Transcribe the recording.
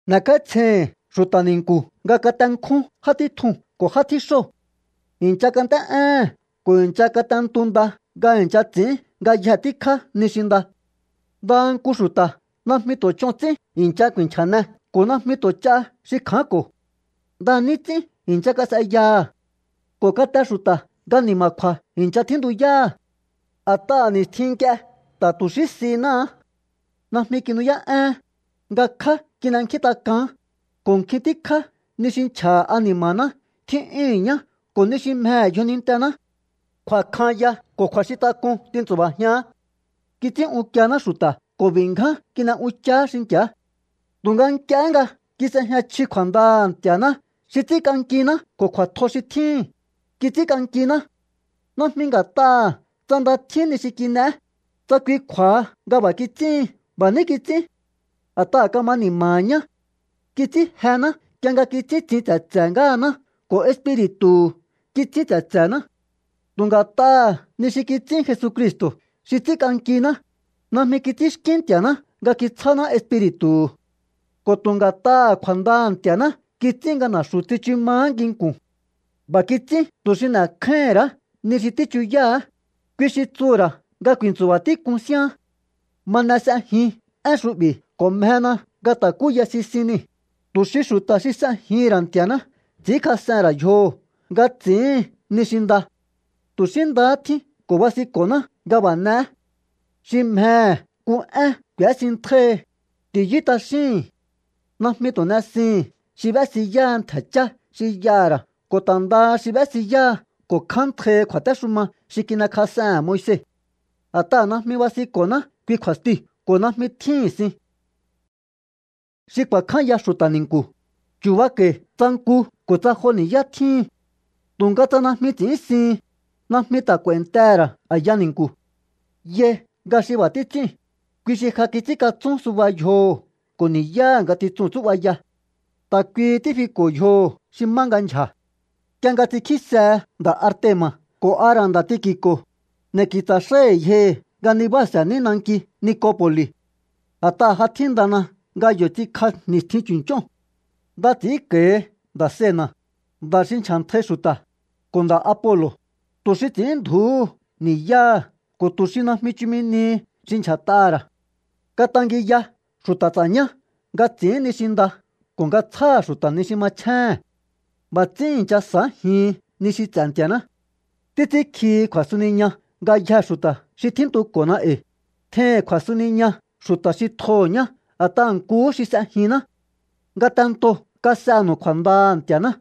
N'e̱kj'áítsjeihi̱n xu̱ta̱ ni̱nku̱ nga katenkjún já títjuu̱n ko̱ já tjíxóo̱. I̱ncha kant'é'éhe̱n ko̱ i̱ncha kat'entu nda nga i̱ncha ts'i̱ín ngayje tíkjá ni xi nda. Ndaha nku xu̱ta̱ najmi tu̱ ch'on ts'ín i̱ncha ku̱i̱nchja̱ne ko̱ najmi tu̱ ch'a xi kjaánko̱. Nda ní ts'ín i̱ncha kas'eyaha̱. Ko̱ kate xu̱ta̱ nga ni̱ma̱kju̱a̱ i̱ncha tjíntuyáha̱. A̱t'aha̱ ni̱stjin nk'ie ta̱ tu̱ xí sináá. Najmi kinu'yá'één, ngakjá kin'enkjíntak'aán, ko̱ nkjin tíkjá ni xi nchja̱ha̱ ani̱ma̱ná tjí'yúhu̱n ñá ko̱ ni xi mjehe̱ yjonintená. Kju̱a̱kjan ya ko̱ kju̱a̱xintak'un tintsu̱ba̱jián. Kits'ín unkiená xu̱ta̱ ko̱ b'i̱ ngján kin'e unchaá xinki̱á. Tu̱nga nk'iehé nga kis'ejña chji kju̱a̱ndaha̱ Nti̱a̱ná xi ts'ínk'ankiná ko̱ kju̱a̱tjo xi tjíhi̱n, kits'ínk'ankiná. Najmi nga̱t'aha̱ tsa nda tjín ni xi kin'eé, tsa kui kju̱a̱ha nga b'a̱ kits'íhin. B'a̱ ní kits'ín a̱t'aha̱ kama ni̱ma̱ha̱ ñá. Kits'ín jená nk'ie nga kits'ín tsin tse̱tse̱ ngáhaná ko̱ Espiri̱tu̱hu̱ kits'ín tse̱tse̱ná. Tu̱ nga̱t'aha̱ ni xi kits'ín Jesucristo̱ xi ts'ínk'ankiná, najmi kits'ínxkín Nti̱a̱ná nga kitsjáná Espiri̱tu̱hu̱. Ko̱ tu̱ nga̱t'aha̱ kju̱a̱ndaha̱ Nti̱a̱ná kits'ín nga na̱xu̱ tsichu maá nginku̱n. B'a̱ kits'ín tu̱ xi n'e̱kjáíhi̱n ra̱á ni xi tíchuyáha̱á, kui xi tsuhu̱ ra̱ nga ku̱i̱ntsu̱ba̱ tík'un síaán. Ma n'e s'ejin én xu'bi̱ ko̱ mjena nga ta̱kuyáí sisin nii̱, tu̱ xi xu̱ta̱ xi s'ejihi̱n ra̱ Nti̱a̱ná ts'i̱ínkjas'ehe̱n ra̱ yjoho̱ nga ts'i̱íhin ni xi nda. Tu̱ xí ndahá tjín ko̱ basinko̱ná nga b'a̱ n'e̱é. Xi mjehe̱ nku én k'u̱ésintjáíhi, ti̱yú t'axíhi̱n. Najmi tu̱ n'esihi̱n xi b'ésiyáha ntje̱ chá xi y'aha̱ ra̱ ko̱ ta̱ ndaha xi b'ésiyáha ko̱ kjántjaihi kju̱a̱téxuma xi kin'ekjas'ehe̱n Moise. A̱t'aha̱ najmi basinko̱ná kui kju̱a̱stiu̱ ko̱ najmi tjíhi̱n sin. Xi ku̱a̱kjánya xu̱ta̱ ni̱nku̱, chu̱bako̱i̱ tsa nku ko̱ tsa jo ni̱yá tjíhin. Tu̱nga tsa najmi ts'i̱ínsihin, najmi ta̱ k'u̱a̱i̱ntehe̱ ra̱ a̱ya ni̱nku̱. Yai nga xi b'a̱ títs'íu̱n, kui xi ja kits'ínkatsún suba yjoho̱ ko̱ ni̱yáha̱ ngatitsuu̱n tsú'baya. Ta̱ kuihi tífiko̱ yjoho̱ xi má nga ndyja̱. Nk'ie nga ts'inkjísehe nda̱ Artema̱ ko̱ a ra̱ nda̱ Tiki̱ko̱, n'e̱ ki̱tsa̱ xái̱hi̱ yjohi̱ nga nibáa̱se̱ní nanki Nikopo̱li̱. A̱t'aha̱ ja tjíndana nga yo̱ ts'inkj'a ni̱stjin chu̱nch'óo̱n. Nda ti̱si̱nko̱i̱ nda̱ Zena̱, nda̱ xi nchja̱ntjai xu̱ta̱, ko̱ nda̱ Apolo̱, tu̱ xi ts'i̱ínndju̱úhu ni̱yáha̱ ko̱ tu̱ xi najmi chumi nihi xi ndyja̱t'aha̱ ra̱. Katangiya xu̱ta̱ ts'a̱ñá nga ts'i̱ín ni xi nda ko̱ nga tsjáha̱ xu̱ta̱ ni xi machjéhe̱n. B'a̱ ts'ín i̱ncha sa̱ájihin ni xi ts'e̱ Nti̱a̱ná. Títs'ínkjihi kju̱a̱suniña ngayjee̱ xu̱ta̱ xi tjíntuko̱na e̱i̱. Tjeihi̱n kju̱a̱suniña xu̱ta̱ xi tjoho̱ ñá a̱t'aha̱ nkuhú xi s'ejinná. Ngatento kas'enu̱u kju̱a̱ndaha̱ Nti̱a̱ná.